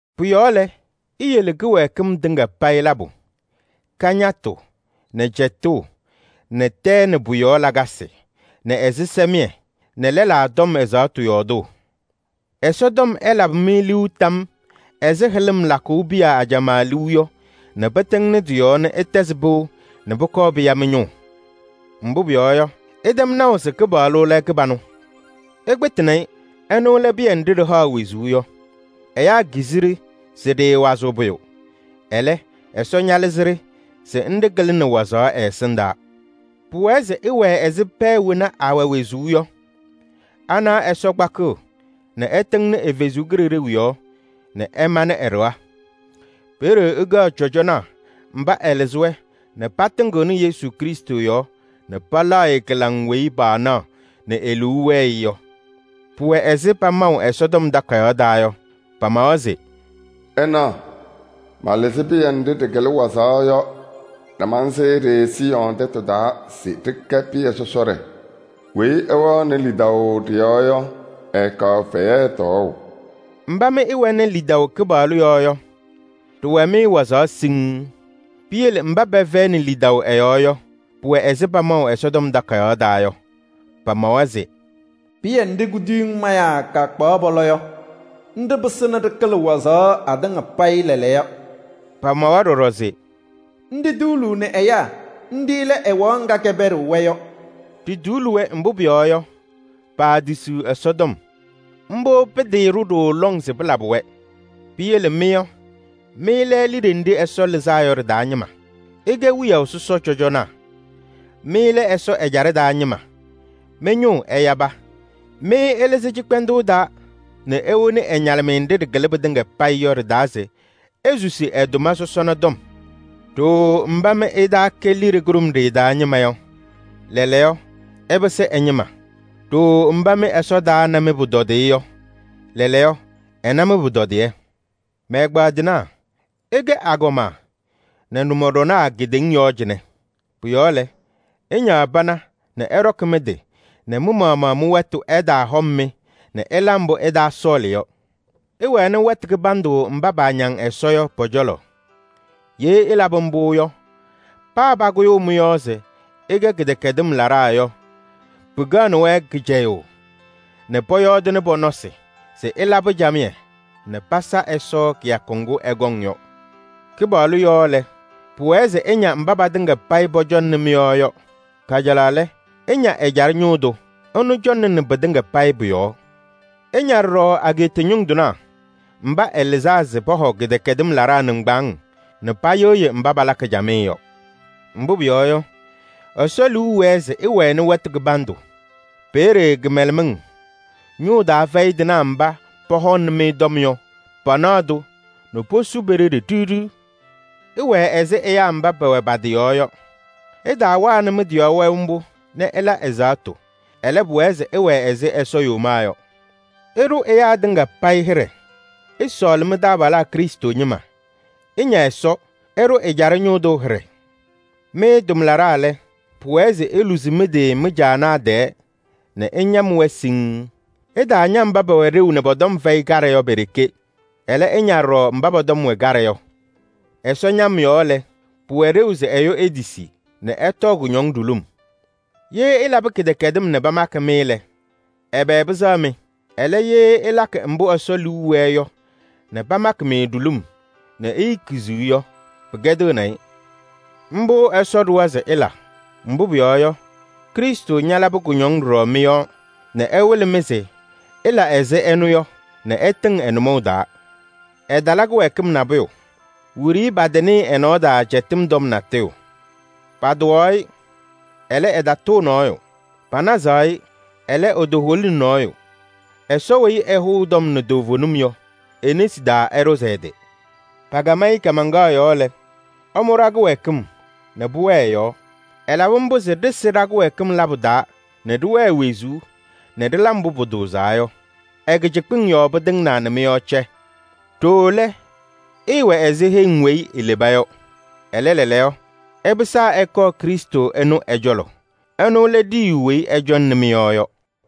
Pʋ-yɔɔ lɛ, iyele kɩwɛɛkɩm tɩŋa payɩ labʋ: kañatʋ nɛ cɛtʋʋ nɛ tɛɛ nɛ pʋ-yɔɔ lakasɩ nɛ ɛzɩsɛmɩyɛ nɛ lɛlaa tɔm ɛzaɣtʋ yɔɔdʋʋ. Ɛsɔtɔm ɛlabɩ-mɩ liu tam ɛzɩ hɩlɩm lakʋʋ piya ajamaa liu yɔ nɛ pɩtɩŋnɩ tɩ-yɔɔ nɛ ɩtɛzɩ pɩʋ nɛ pʋkɔɔ pɩya mɩ-ñʋʋ. Mbʋ pʋyɔɔ yɔ, ɩtɛm naʋ se Kɩpaɣlʋ lɛ kɩbanʋ. Ɩkpɩtɩnɩ-ɩ. Ɛnʋ lɛ pɩyɛ nɖɩ ɖɩhaɣ wezuu yɔ, ɛyaa kizi-ɖɩ se ɖɩɩwazɩɣ pʋyʋ. Ɛlɛ, Ɛsɔ ñalɩzɩ-ɖɩ se nɖɩ kɩlɩnɩ wazaɣ ɛ-ɛsɩndaa. Pʋwɛɛ se ɩwɛɛ ɛzɩ pɛɛ wena awɛ wezuu yɔ. Anaɣ Ɛsɔ tɩŋɩɣnɩ ɛ-Kalɩzaɣ yɔɔ nɛ ɛmanɩ ɛ-ɖɩɣa. Peeye ɩkɛɣ cɔjɔnaa mba ɛlɩzɩ-wɛ nɛ patɩŋɩɣnɩ Yesu Krɩstʋ yɔɔ nɛ palaɣ-ɩ kɩlaŋ weyi paanaɣ nɛ e-liu wɛɛ-ɩ yɔ. Pʋwɛ ɛzɩ pamaʋ Ɛsɔtɔm Takayaɣ taa yɔ. Pamawa se: “Ɩnaɣ, malɩzɩ pɩyɛ nɖɩ ɖɩkɩlɩ wazaɣ yɔ nɛ mansɩɩ-ɖɩ Siiyɔɔ tɛtʋ taa. Weyi ɛwɛɣnɩ lidaʋ ɖɩ-yɔɔ yɔ, ɛɛkaɣ fɛyɛ tɔɔʋ.” Mba mɩ ɩwɛnɩ lidaʋ Kɩpaɣlʋ yɔɔ yɔ, ɖɩwɛ-mɩ wazaɣ siŋŋ. Piyele mba pɛfɛyɩnɩ lidaʋ ɛ-yɔɔ yɔ, pʋwɛ-wɛ ɛzɩ pamaʋ Ɛsɔtɔm Takayaɣ taa yɔ. Pamawa se: “Pɩyɛ nɖɩ kuduyiŋ mayaa kpaɣaɣ pɔlɔ yɔ, nɖɩ pɩsɩnɩ ɖɩkɩlɩ wazaɣ atɩŋa payɩ lɛɛlɛɛyɔ.” Pamawa ɖɔɖɔ se: “Nɖɩ tuuluuni ɛyaa, nɖɩ lɛ ɛwaɣ ŋga kɛpɛɖɩɣ-wɛ yɔ.” Ɖituuli-wɛ, mbʋ pʋyɔɔ yɔ, paatisiɣ Ɛsɔtɔm. Mbʋ pɩɩtɩɩɖʋ ɖooo lɔŋ se pɩlabɩ-wɛ. Piyele mɩ yɔ, mɩ lɛ liɖe nɖɩ Ɛsɔ lɩzaa yɔ ɖɩ-taa ñɩma. Ɩkɛ wiyaʋ sɔsɔ cɔjɔnaa. Mɩ lɛ Ɛsɔ ɛjaɖɛ taa ñɩma, mɩ-ñʋʋ ɛyaba. Mɩ ɛlɩzɩ cɩkpɛndʋʋ taa nɛ ewoni ɛ-ñalɩmɩyɛ nɖɩ ɖɩkɩlɩ pɩtɩŋa payɩ yɔ ɖɩ-taa se isusi ɛ-tʋma sɔsɔna tɔm. Ɖooo mba mɩ ɩtaakɛ liɖe kʋɖʋmɖɩyɛ taa ñɩma yɔ, lɛɛlɛɛyɔ, ɩpɩsɩ ɛ-ñɩma. Ɖooo mba mɩ Ɛsɔ taana mɩ-pʋtɔdɩyɛ yɔ, lɛɛlɛɛyɔ, ɛna mɩ-pʋtɔdɩyɛ. Mɛ-ɛgbaadɩnaa! Ɩkɛ agɔma nɛ nʋmɔɖɔnaa kedeŋa yɔɔ cɩnɛ. Pʋ-yɔɔ lɛ, ɩñaɣ pana nɛ ɩɖɔkɩ mɩ-tɩ nɛ mɩ-maɣmaɣ mɩ-wɛtʋ ɛtaahɔm-mɩ nɛ ɩla mbʋ ɩtaasɔɔlɩ yɔ. Ɩwɛnɩ wɛtʋ kɩbandʋ mba paañaŋ Ɛsɔ yɔ pɔ-cɔlɔ. Ye ɩlabɩ mbʋ yɔ, paa pakʋyʋʋ mɩ-yɔɔ se ɩkɛ kɩdɛkɛdɩm laɖaa yɔ, pɩkɛɣnɩ-wɛ kɩcɛyʋʋ nɛ pɔyɔɔdɩnɩ pɔ-nɔɔ se ɩlabɩ camɩyɛ nɛ pasa Ɛsɔ kɩyakʋ ŋgʋ ɛkɔŋ yɔ. Kɩpaɣlʋ yɔɔ lɛ, pʋwɛɛ se ɩña mba patɩŋa payɩ pɔcɔŋnɩ mɩ-yɔɔ yɔ. Kajalaɣ lɛ, ɩña ɛjaɖɛ ñʋʋ tʋ. Ɛnʋ cɔŋnɩnɩ pɩtɩŋa payɩ pʋ-yɔɔ. Ɩña ɖɔɖɔ ageeta ñʋŋ tɩnaa mba ɛlɩzaa se pɔhɔ kɩdɛkɛdɩm laɖaa nɩŋgbaaŋ nɛ payɩɣyɩ mba palakɩ camɩyɛ yɔ. Mbʋ pʋyɔɔ yɔ, Ɛsɔ liu wɛɛ se ɩwɛnɩ wɛtʋ kɩbandʋ. Peeye kɩmɛlɛmɩŋ, ñʋʋ taa fɛyɩ tɩnaa mba pɔhɔŋnɩ-mɩ tɔm yɔ, panaɣ-tʋ nɛ posu pe-ɖeɖe ɖiɣ ɖiɣ. Ɩwɛɛ ɛzɩ ɛyaa mba pɛwɛ pa-tɩ yɔɔ yɔ. Ɩtaawanɩ mɩ-tɩ yɔɔ wɛʋ mbʋ nɛ ɩla ɛzaɣtʋ, ɛlɛ, pʋwɛɛ se ɩwɛɛ ɛzɩ Ɛsɔ yomaa yɔ. Ɩɖʋ ɛyaa tɩŋa payɩ hɩɖɛ. Ɩsɔɔlɩ mɩ-taabalaa Krɩstʋ ñɩma. Ɩña Ɛsɔ. Ɩɖʋ ɛjaɖɛ ñʋʋ tʋ hɩɖɛ. Mɩ tʋmlaɖaa lɛ, pʋwɛɛ se iluzi mɩ-tɩ mɩ-caanaa tɛɛ nɛ ɩñam-wɛ siŋŋ. Ɩtaaña mba pɛwɛ ɖeu nɛ pɔ-tɔm fɛyɩ kaɖɛ yɔ pe-ɖeke. Ɛlɛ, ɩña ɖɔɖɔ mba pɔ-tɔm wɛ kaɖɛ yɔ. Ɛsɔ ñam yɔɔ lɛ, pʋwɛ ɖeu se ɛyʋ etisi nɛ ɛtɔɔ kʋñɔŋ ɖulum. Ye ɩlabɩ kɩdɛkɛdɩm nɛ pamakɩ-mɩ lɛ, ɛbɛ pɩsɛɣ-mɩ? Ɛlɛ, ye ɩlakɩ mbʋ Ɛsɔ liu wɛɛ yɔ nɛ pamakɩ-mɩ ɖulum nɛ iikiziɣ yɔ, pɩkɛdɩɣnɩ-ɩ. Mbʋ Ɛsɔ ɖʋwa se ɩla. Mbʋ pʋyɔɔ yɔ, Krɩstʋ ñalabɩ kʋñɔŋ ɖɔɖɔ mɩ-yɔɔ nɛ ɛwɩlɩ-mɩ se ɩla ɛzɩ ɛnʋ yɔ nɛ ɩtɩŋ ɛ-nʋmɔʋ taa. Ɛtala kɩwɛɛkɩm nabʋyʋ. Wiɖiyi patanɩɩ ɛ-nɔɔ taa cɛtɩm tɔm natʋyʋ. Patʋwaɣ-ɩ, ɛlɛ, ɛtatʋʋ nɔɔyʋ. Panazaɣ-ɩ, ɛlɛ, etoholini nɔɔyʋ. Ɛsɔ weyi ɛhʋʋ tɔm nɛ toovenim yɔ, e-nesi taa ɛɖʋzɩ ɛ-tɩ. Pakam-ɩ kaamaŋkaɣ yɔɔ lɛ, ɛmʋ ɖa-kɩwɛɛkɩm nɛ pʋwɛɛ ɛ-yɔɔ. Ɛlabɩ mbʋ se ɖɩsɩ ɖa-kɩwɛɛkɩm labʋ taa nɛ ɖɩwɛɛ wezuu nɛ ɖɩla mbʋ pʋtʋʋzaa yɔ. Ɛ-kɩcɩkpɩŋ yɔɔ pɩtɩŋnaa nɛ mɩ-yɔɔ cɛ. Ɖooo lɛ, ɩɩwɛ ɛzɩ heŋ weyi ileba yɔ. Ɛlɛ, lɛɛlɛɛyɔ ɩpɩsaa ɩkɔɔ Krɩstʋ ɛnʋ ɛ-cɔlɔ. Ɛnʋ lɛ ɖiyiyu weyi ɛcɔŋnɩ mɩ-yɔɔ yɔ.